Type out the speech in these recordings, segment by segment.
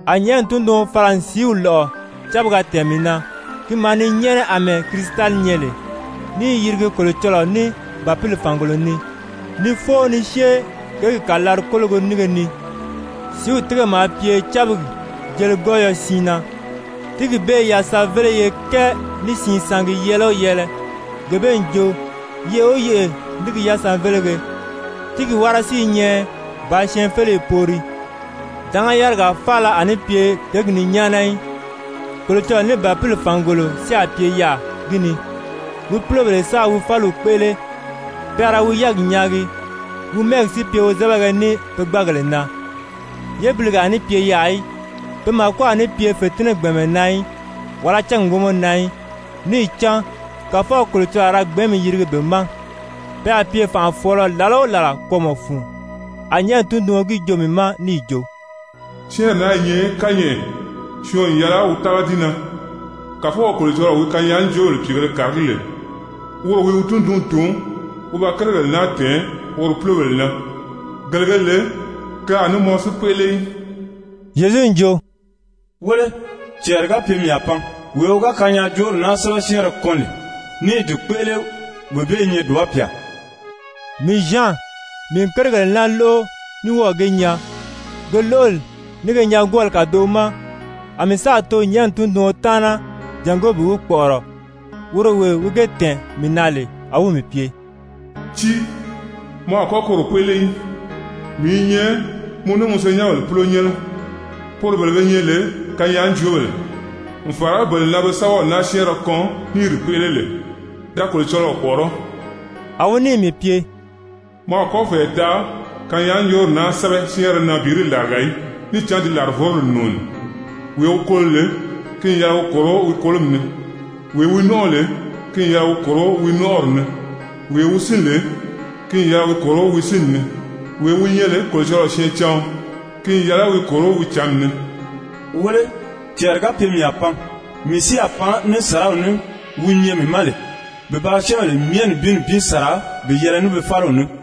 A nyɛ̀ʔɛni tunduɔn fala n sìíw lɔ́ʔɔ cábiga tɛ̀ɛn mii na, ki maa ni nyɛ́ʔɛnɛ àmɛɛ kirisitali nyɛ lè, ní i yirigi Kolocɔlɔɔ ní Bàpili fàngolo ni, ni fóo ni syée kěgi kàlari-kólogo nínge ni. Sìíw tíige maa pye cábigi jeligɔyɔ siin na, tíigi bee i yasanveleye kɛɛ ní siin sangi yɛɛlɛ o yɛɛlɛ, gee bee n jo, yeʔe o yeʔe ní gi yasanvelege. Tíigi wára si i nyɛ bàā syɛɛnfeleyi poori. Dánga yárigaa faala a ní pye kěgi ni nyáana í. Kolocɔlɔɔ ní Bàpili fàngolo si a pye yaà gi ni, wi púlobèle sáā wi fáliw kpéʔele. Pe a ra wi yɛ́ɛgi nyaagi, wi mɛ́ɛgi si pye wozɛbɛgɛ ní pe gbáagèle na. Yébilige a ní pye yaà í, pe màko a ní pye fètinnɛ gbɛ̀ɛnmɛ na í, wàlá cángi wómɔ na í, níì cán Kàfɔw Kolocɔlɔɔ a ra gbɛ̀ɛ́nmi yirigi be ma. Pe a pye fànʔafɔɔlɔ làla o làla kwɔ́ɔmɔ fun. A nyɛ̀ʔɛni tunduɔn gi joo mii ma níì jo: «Syɛ́ɛnri naa i nyɛ kányɛʔɛ, syɔɔn n yɛlɛ wi tága di na. Kàfɔw Kolocɔlɔɔ wi kanyaajoobèle pìigēle kàragí lè, woro wi wi tundunw tun wi ba kérigèle naa tɛ̀ɛn woro púlobèle na, gele ge lè ke a ní mɔn si kpéʔele í.» Zyezu n jo: «Wéle, cɛɛri ga pye mii a pan. Wee wi ga kanyaajoori naa sɛ́bɛ syɛ́ɛnrɛ kɔn lè ní i di kpéʔele, wee bee i nyɛ dùba pyà!» Mii Zyan, mii n kérigèle naa lóʔo ní wɔ́ɔ̀ ge nyaa. Ke lóʔoli ní ge nyaagwɔɔli kàdoʔo ma, a mii sáà too nyɛ̀ʔɛni tunduɔn taana jàngó bi wi kpɔ̀ʔɔrɔ, woro wee wi ge tɛ̀ɛn mii na lè. A wi si mii pye: «Tíi, mɔ a kɔ́ koro kpéʔele í! Mii i nyɛ mɔ ní mɔ senyɛnbèle púlonyɛnnɛ, poro bele be nyɛ lè kanyaajoobèle, n fàra bele na be sɛ́bɛw naa syɛ́ɛnrɛ kɔn ní i di kpéʔele lè. Da Kolocɔlɔɔ kpɔ̀ʔɔrɔ́!» A wi níì mii pye: «Mɔ a kɔ́ fɛ̀ɛ taʔa kanyaajoori naa sɛ́bɛ syɛ́ɛnrɛ na bi di làriga í, níì cán ti làrivoroli n nùuni. Wee wi kolo lè, ki n yɛlɛ wi kòro wi kolomi ni, wee wi nɔ́nʔɔ lè, ki n yɛlɛ wi kòro wi nɔ́nʔɔri ni, wee wi sín lè, ki n yɛlɛ wi kòro wi sínni ni, wee wi nyɛ lè Kolocɔlɔɔ syɛɛncaɔn, ki n yɛlɛ wi kòro wi cǎnmi ni. Wéle, cɛɛri ga pye mii a pan, mii si a pan ní sàraw ní wi nyɛ mii ma lè, bi ba syɛ́ɛnbèle myɛ nibin nibin sàra bi yɛlɛ ní be fáliw ní.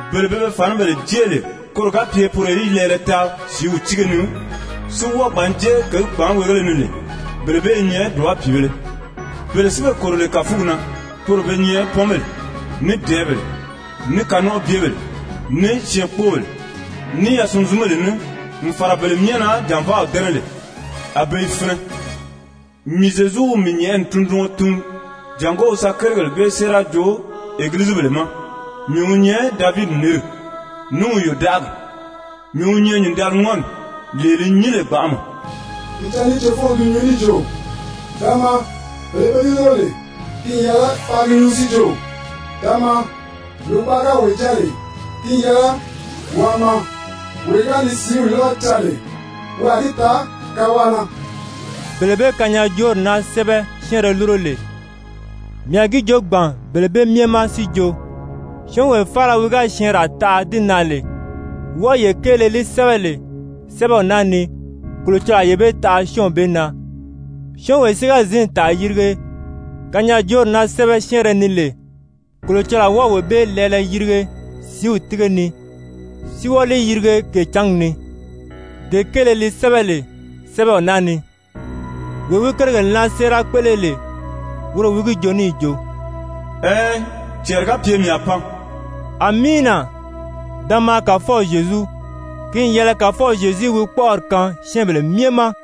Bele be be fànibèle jée lè koro ga pye poro í lɛɛlɛ taa sìíw tíige ni, si wɔ́ɔ gbǎn jée kěgi kpàánweegéle ni lè, bele bee i nyɛ dùba pìibēle! Bele si be kòro lè kàfugi na, poro be nyɛ pɔ́nbèle, ní dɛ̀ɛ́bèle, ní kanɔnʔɔbyebèle, ní syɛɛnkpoobèle, ní yasunzunbèle ní, n fàra bele myɛ na jànvaaw dɛ́nɛ lè, a be i finɛ. Mii Zyezu wi mii nyɛ̀ʔɛni tunduɔn tun jàngó wi sa kérigèle bee séera joo Egilizibèle ma. Mii wi nyɛ Davidi nǐnri, ní wi yòdaʔagi, mii wi nyɛ Nyǐndaliŋɔni, lee li nyín lè gbanʔama.» Pìicǎnni ní cefɔnw i gi nyuu níì jo: «Da maa!» Bele be di lúro lè, ki n yɛlɛ paa gi nyuu si jo: «Da maa!» Lògbaʔa ga wee jáa lè, ki n yɛlɛ waa maa. Wee wi ga ni sìíw lɔ́ʔɔ caa lè, wi a gi taa kawaʔa na! Bele be kanyaajoori naa sɛ́bɛ syɛ́ɛnrɛ lúro lè, mii a gi joo gbàn bele bee myɛ ma si jo, syɔ́ɔnwee faala wi ga syɛɛnraa taʔa di na lè, wɔʔɔyee kéele li sɛ́bɛ lè sɛ́bɛw naa ni, Kolocɔlɔɔ a yee bee taʔa syɔ́ɔnw bee na. Syɔ́ɔnwee si ga zǐn tàa yirige kanyaajoori naa sɛ́bɛ syɛɛnrɛ ni lè, Kolocɔlɔɔ a wɔ́ɔ wee bee lɛɛlɛ yirige sìíw tíige ni si wɔ́ɔ li yirige kècǎngi ni, dee kéele li sɛ́bɛ lè sɛ́bɛw naa ni. Wee wi kérigèle naa séera kpéʔele lè, woro wi gi joo níì jo: «Ɛɛn, cɛɛri ga pye mii a pan.» «Amiina! Da maa Kàfɔw Zyezu!» Ki n yɛlɛ Kàfɔw Zyezu í wi kpɔ́ʔɔri kaan syɛ́ɛnbèle myɛ ma!